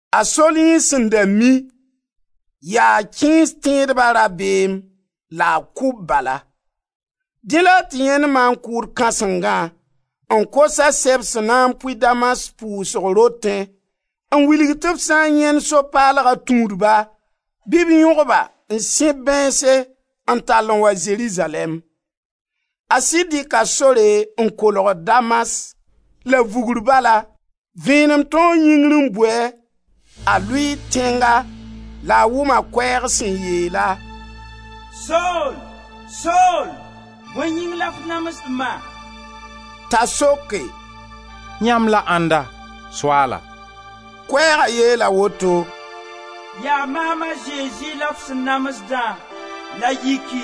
A Sol yẽ sẽn da mi, yaa kẽes tẽedba rabeem la a kʋ-b bala. Dẽ la a tɩ yãend maan-kʋʋd kãsengã n kos-a sɛb sẽn na n pʋɩ Damas pʋʋsg rotẽ n wilg tɩ b sã n yãend So-paalga tũudba, bɩ b yõg-ba n sẽb bãeense n tall n wa Zerizalɛɛm. A sɩd dɩka sore n kolgd Damas; la vugr bala vẽenem tãoo yĩngr n bu-a. A lʋɩɩ tẽnga la a wʋma koɛɛg sẽn yeel-a: «Sol, Sol, bõe yĩng la f namsd ma?» T'a soke: «Yãmb la ãnda, Soaala?» Koɛɛga yeela woto: «Yaa maam a Zezi la f sẽn namsdã. La yiki!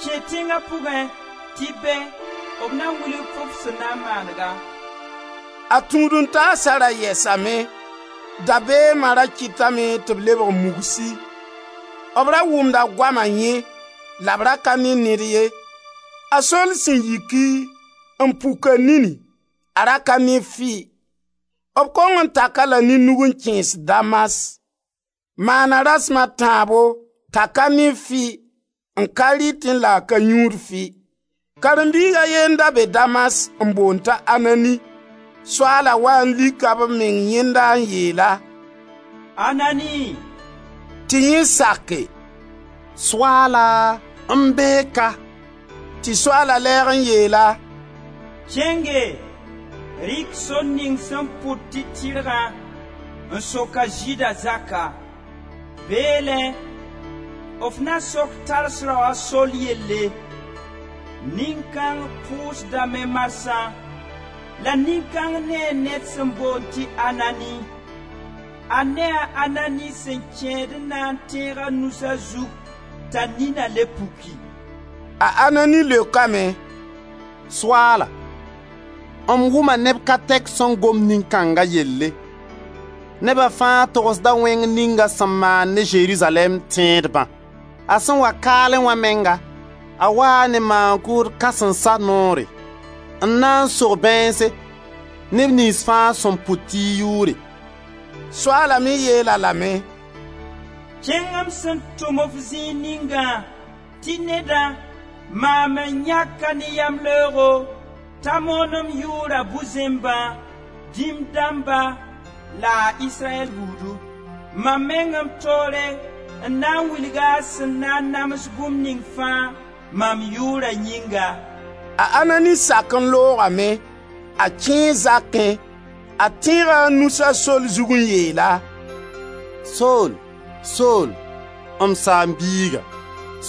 Kẽ tẽnga pʋgẽ tɩ be b na wilg-f f sẽn na n maanega.» A tũud-n-taasa ra yɛsame, dabeema ra kɩtame tɩ b lebg mugsi; b ra wʋmda goama yẽ, la b ra ka ne ned ye. A Sol sẽn yiki, n puk a nini, a ra ka ne fɩ. B kong n tak-a la ne nug n kẽes Damas. Maana rasem a tãabo t'a ka ne fɩ, n ka rɩtẽ la a ka yũud fɩ. Karen-biig a ye n da be Damas n boond t'a Anani. Soaala waa n lika b meng yẽnda n yeel-a: «Anani!» Tɩ yẽ sake: «Soaala, m bee ka.» Tɩ Soaala lɛɛg n yeel-a: «Kẽnge, rɩk sor ning sẽn pʋd tɩ Tɩrgã, n sok a Zɩɩda zaka. Beelẽ f na sok Tars rao a Sol yelle. Nin-kãng pʋʋsdame marsã, la nin-kãng nee ned sẽn boond tɩ Anani. A nee a Anani sẽn kẽed n na n tẽeg a nus a zug t'a nina le puki.» A Anani leokame: «Soaala, m wʋma neb ka tɛk sẽn gom nin-kãnga yelle. Neba fãa togsda wẽng ning a sẽn maan ne Zerizalɛɛm tẽedbã. A sẽn wa kaalẽ wã menga, a waa ne Maan-kʋʋd kãsensa noore n na n sog bãeense neb niyns fãa sẽn pʋt y yʋʋre.» Soaala me yeel-a lame: «Kẽng m sẽn tʋm-f zĩig ningã tɩ nedã, maam n yãk-a ne yamleoogo, t'a moon m yʋʋra bu-zẽmbã, dĩm dãmba la a Israyɛl buudu. Mam meng m toore n na n wilg-a a sẽn na n nams bũmb ning fãa, mam yʋʋra yĩnga.» A Anani sak n loogame, a kẽe zakẽ, a tẽega a nus a Sol zug n yeel-a: «Sol, Sol, m saam-biiga,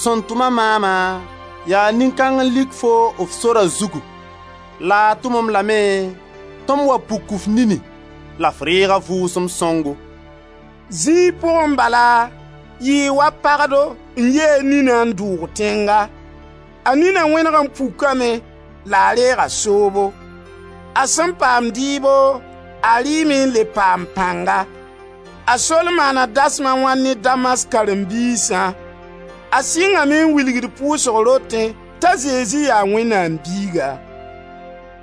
sẽn tʋm-a maama, yaa nin kãng n lik foo f sora zugu la a tʋm-m lame tɩ m wa puk f nini la f reeg a Vʋʋsem Sõngo.» Zĩig pʋgẽ bala yɩɩ wa pagdo n yi a nina n dʋʋg tẽnga. A nina wẽneg n pukame la a reega soobo. A sẽn paam dɩɩbo, a rɩɩme n le paam pãnga. A Sol sẽn moond bũmb ninga Damas A Sol maana dasem a wãn ne Damas karen-biisã. A sɩngame n wilgd pʋʋsg rotẽ t'a Zezi yaa Wẽnnaam Biiga.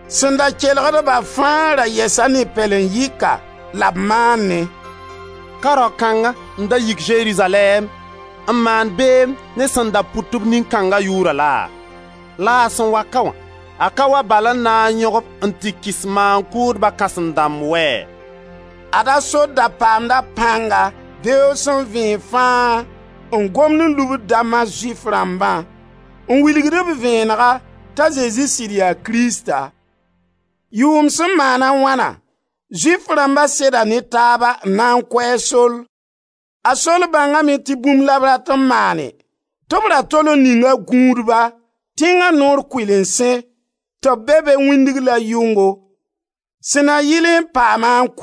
Sẽn da kelgdba fãa ra yɛsa ne pɛlen-yɩka la b maanẽ: «Ka rao kãnga n da yik Zerizalɛɛm n maan beem ne sẽn da pʋt-b Nin-kãnga Yʋʋra laa? La a sẽn wa ka wã, a ka wa bal n na n yõg-b n tɩ kɩs maan-kʋʋdba kãsem-dãmb wɛɛ?» Ad a Sol da paamda pãnga beoog sẽn vẽeg fãa n gomd n lubd Damas Zʋɩf rãmbã, n wilgd-b vẽenega t'a Zezi sɩd yaa Krista. Yʋʋm sẽn maan a wãna, Zʋɩf rãmba seda ne taaba n na n kʋ a Sol. A Sol bãngame tɩ bũmb la b rat n maane, tɩ b ra tol n ninga gũudba tẽnga noor kʋɩlensẽ, tɩ b be be wĩndg la yʋngo, sẽn na yɩlẽ n paam-a n kʋ.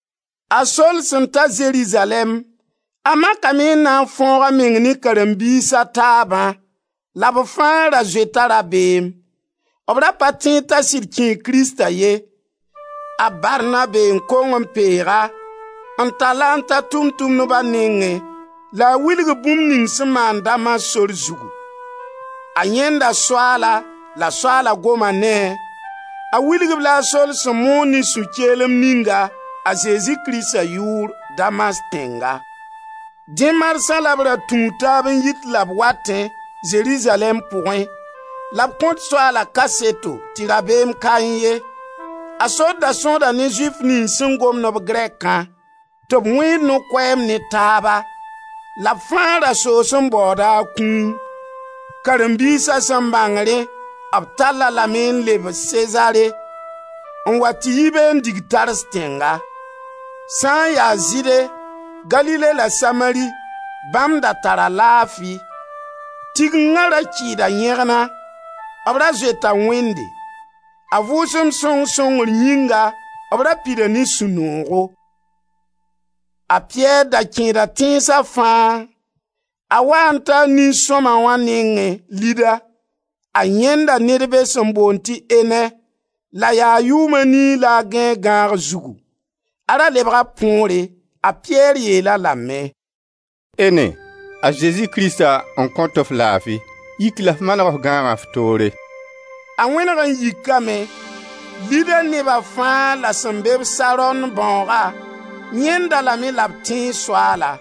A Sol sẽn ta Zerizalɛɛm, a makame n na n fãoog a meng ne karen-biis a taabã la b fãa ra zoeta rabeem; b ra pa tẽed t'a sɩd kẽe Krista ye. A Barnabe n kong n peeg-a, n tall-a n ta Tʋʋm-tʋmdba nengẽ la a wilg-b bũmb ning sẽn maan Damas sor zugu: a yãenda Soaala la Soaala goma ne-a. A wilg-b-la a Sol sẽn moon, ne sũ-keelem ninga a Zezi Krista yʋʋr Damas tẽnga. Dẽ marsã la b ra tũud taab n yit la b watẽ, Zerizalɛɛm pʋgẽ, la b kõt Soaala kaseto tɩ rabeem kaẽ ye. A Sol da sõsda ne Zʋɩf niyns sẽn gomd-b grɛkã, tɩ b wẽed no-koɛɛm ne taaba. La b fãa ra soos n baooda a kũum. Karen-biisa sẽn bãng rẽ b tall-a lame m leb Sezare, n wa tɩ yi be n dig Tars tẽnga. Sã n ya Zɩɩde, Galile la Samari, bãmb da tara laafi. Tigenga ra kɩɩda yẽgna. B ra zoeta Wẽnde. A Vʋʋsem Sõng sõngr yĩnga, b ra pida ne sũ-noogo. A Piyɛr da kẽeda tẽnsa fãa; a waa n taa nin-sõma wã nengẽ Lida. A yãenda ned be sẽn boond tɩ Ene, la yaa yʋʋm a nii la a gãe a gãag zugu: a ra lebga põore. A Piyɛr yeel-a lame: «Ene, a Zezi Krista n kõt-f laafi. Yik la f maneg f gãaga f toore.» A wẽneg n yikame. Lida neba fãa la sẽn be-b Saron bãooga, yãend-a lame la b tẽe Soaala.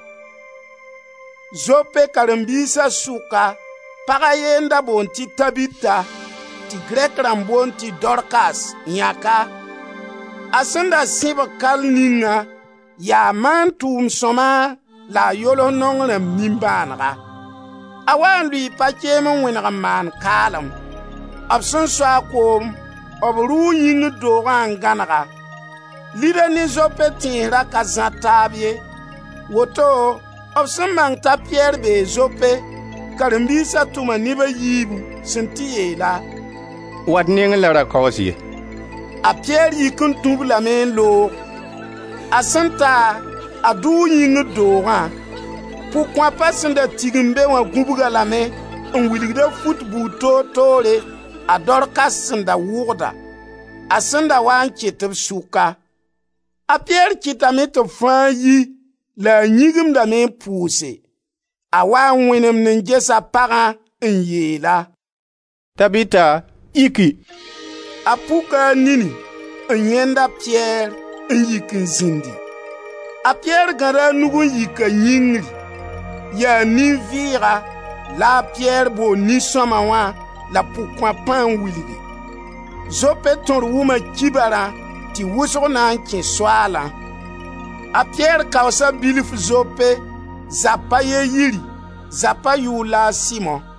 Zope karen-biisa sʋka pag a ye n da boond tɩ Tabita, tɩ Grɛk rãmb boond tɩ Dorkas (Yãka). A sẽn da sẽbg kall ningã yaa maan tʋʋm sõma la a yols naong rãmb nimbãanega. A waa n lʋɩɩ pakeem n wẽneg n maan kaalem. B sẽn so-a koom b rʋʋ yĩngr doogã n gãneg-a. Lida ne Zope tẽns ra ka zãr taab ye, woto b sẽn bãng t'a Piyɛr bee Zope, karen-biisa tʋma neb a yiibu sẽn tɩ yeel-a: «Wa d nengẽ la ra kaoos ye.» A Piyɛr yik n tũ-b lame n loog. A sẽn ta, a dʋʋ yĩngri doogã. Pʋg-kõapa sẽn da tigim be wã gũbg-a lame n wilgd-a fut buud toor toore a Dorkas sẽn da wʋgda, a sẽn da waa n ket b sʋka. A Piyɛr kɩtame tɩ b fãa yi la a yĩgimdame n pʋʋse. A waa n wẽnemd n gesa pagã n yeel-a: «Tabita, yiki!» A puka a nini, n yãend a Piyɛr, n yik n zĩndi. A Piyɛr gãda a nug n yik-a yĩngri. Yaa nin-vɩɩga la a Piyɛr bool nin-sõma wã la pʋg-kõapã n wilgi. Zope tõr wʋma kibarã, tɩ wʋsg na n kẽ Soaalã. A Piyɛr kaoosa bilf Zope, zapa a ye yiri, zapa yʋʋr la a Simo.